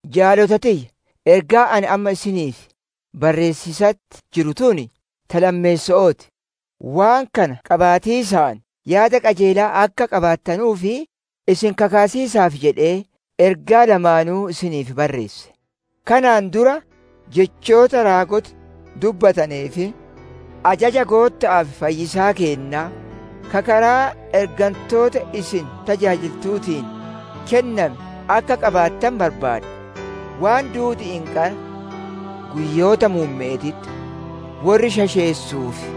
Jaalota tiyya! Ergaan ani amma isiniif barreessiisatti jiru tun, ta lammeesso'oo ti. Waan kana qaabatiisaan yaada qajeelaa akka qabaattanuuf, isin kakkaasiisaaf jedhee, ergaa lamaanuu isiniif barreesse. Kanaan dura jechoota raagoti dubbatanee fi ajaja Gootta'aa fi Fayyisaa keennaa, ka karaa ergantoota isin tajaajiltuutiin kenname akka qaabattanu barbaada. Waan duudi'iin qara, guyyoota muumme'eetitti worri shasheessuu fi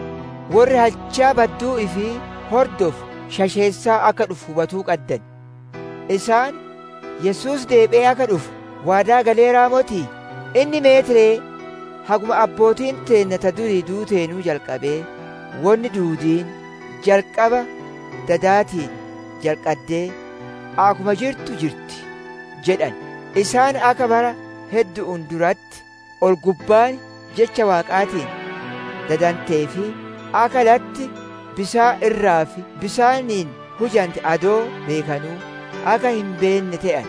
worri halchaa badduu ifii hordofu shasheessaa akka dhufu hubatuu qaddan. Isaan, «Yesuus deebi'ee akka dhufu waadaa galeeraa motii? Inni meet ree? Haguma abbootiin teenna ta durii duuteenuu jalqabee, wonni duudiin jalqaba dadaatiin jalqaddee akkuma jirtu jirti!» jedhan. Isaan akka bara heddu'uun duratti, ol-gubbaan jecha Waaqaatiin dadantee fi akka latti bisaan irraa fi bisaaniin hujante adoo beekanu akka hin beennee te'an.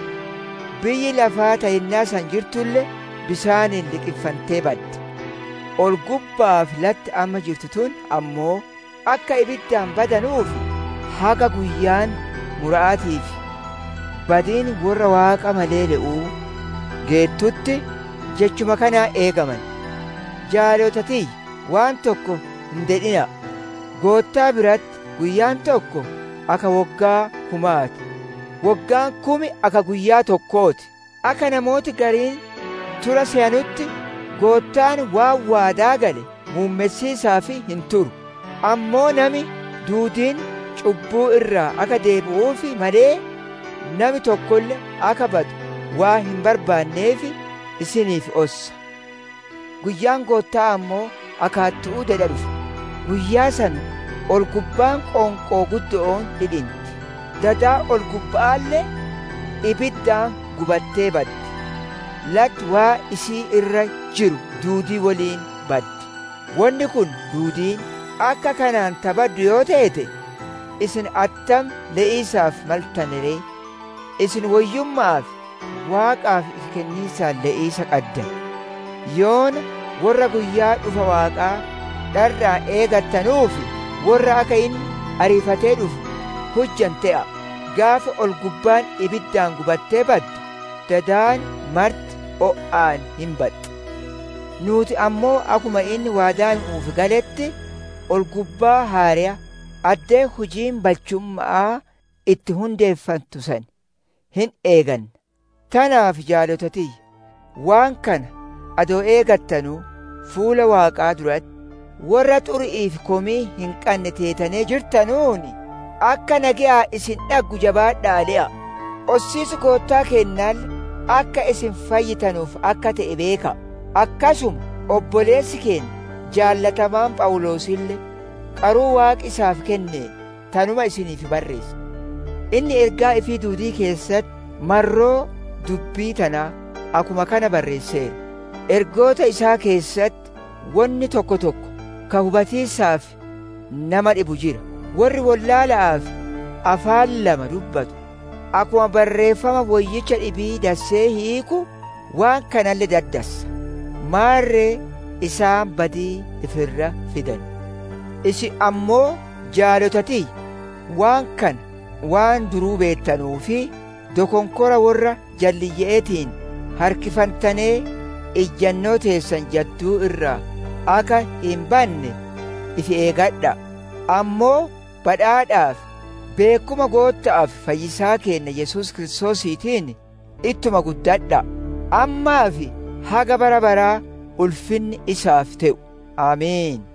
Biyyi lafaa ta yennaa san jirtulle, bisaaniin liqinfantee badde. Ol-gubba'aa fi latti amma jirtu tun ammoo, akka ibiddaan badanuuf, haga guyyaan mura'aatii fi badiin worra Waaqa malee le'uu geettutti, jechuma kanaan eegaman. Jaalota tiyya, waan tokko hin dedhina'a! Goottaa biratti guyyaan tokko akka woggaa kumaa ti; woggaan kum akka guyyaa tokkoo ti. Akka namooti gariin tura seyanutti Goottaan waan waadaa gale muummessiisaaf hin turu. Ammoo nami duudiin cubbuu irraa akka deebi'uuf malee, nami tokkolle akka badu waan hin barbaanneef, isiniif ossa. Guyyaan Gootta'aa ammoo akka hattu'uu dedha dhufa; guyyaa san ol-gubbaan qoonqoo guddo'oon dhidhinti; dadi ol-gubba'aalle ibiddaan gubattee baddi; latti waan isii irra jiru duudii woliin hin baddi. Wonni kun duudiin akka kanaan ta baddu yoo teete, isin attam le'iisaaf maltane ree? Isin woyyumma'aa fi Waaqaaf ifi kenniisaan le'iisa qaddan. Yoona worra guyyaa dhufa Waaqaa dharra'aan eegattanuu fi worra akka inni ariifatee dhufu hujanu te'a'a. Gaafa ol-gubbaan ibiddaan gubattee baddu, dadi marti o'aan hin baxxi. Nuuti ammoo akkuma inni waadaa nu'uuf galetti, ol-gubbaa haareya, addee hujiin balchumma'aa itti hundeefantu san hin eeganna. Tanaaf jaalota tiyya! Waan kana adoo eegattanuu, fuula Waaqaa duratti worra xuri'ii fi komii hin qanne teetanee jirtanuun, akka nageyaan isin dhaggu jabaadha'aa le'a'a. Ossiis Goottaa keennaalle akka isin fayyitanuuf akka te'e beeka'a! Akkasuma obboleessi keenna jaalatamaan Phawuloosille qaruu Waaqi isaaf kenneen tanuma isiniif barreesse. Inni ergaa ifii duudii keessatti marroo dubbii tanaa akkuma kana barreesseera. Ergaa isaa keessatti wonni tokko tokko ka hubatiisaaf nama dhibu jira. Worri wollaala'aa fi afaan lama dubbatu akkuma Barreeffama Woyyicha dhibii dassee hiiku, waan kanalle daddassa. Maarre isaan badii ifi irratti fidan. Isin ammoo, jaalota tiyya! Waan kana waan duruu beettanuuf dokonkora worra jalliye'eetiin harkifantanee ijjanoo teessan jadduu irraa akka hin banne, ifi eegadha'a. Ammoo badhaadhaa fi beekkuma Gootta'aa fi Fayyisaa keenna Yesuus Kiristoosiitiin ittuma guddadha'a. Ammaa fi haga bara baraa ulfinni isaaf te'u! Ameen.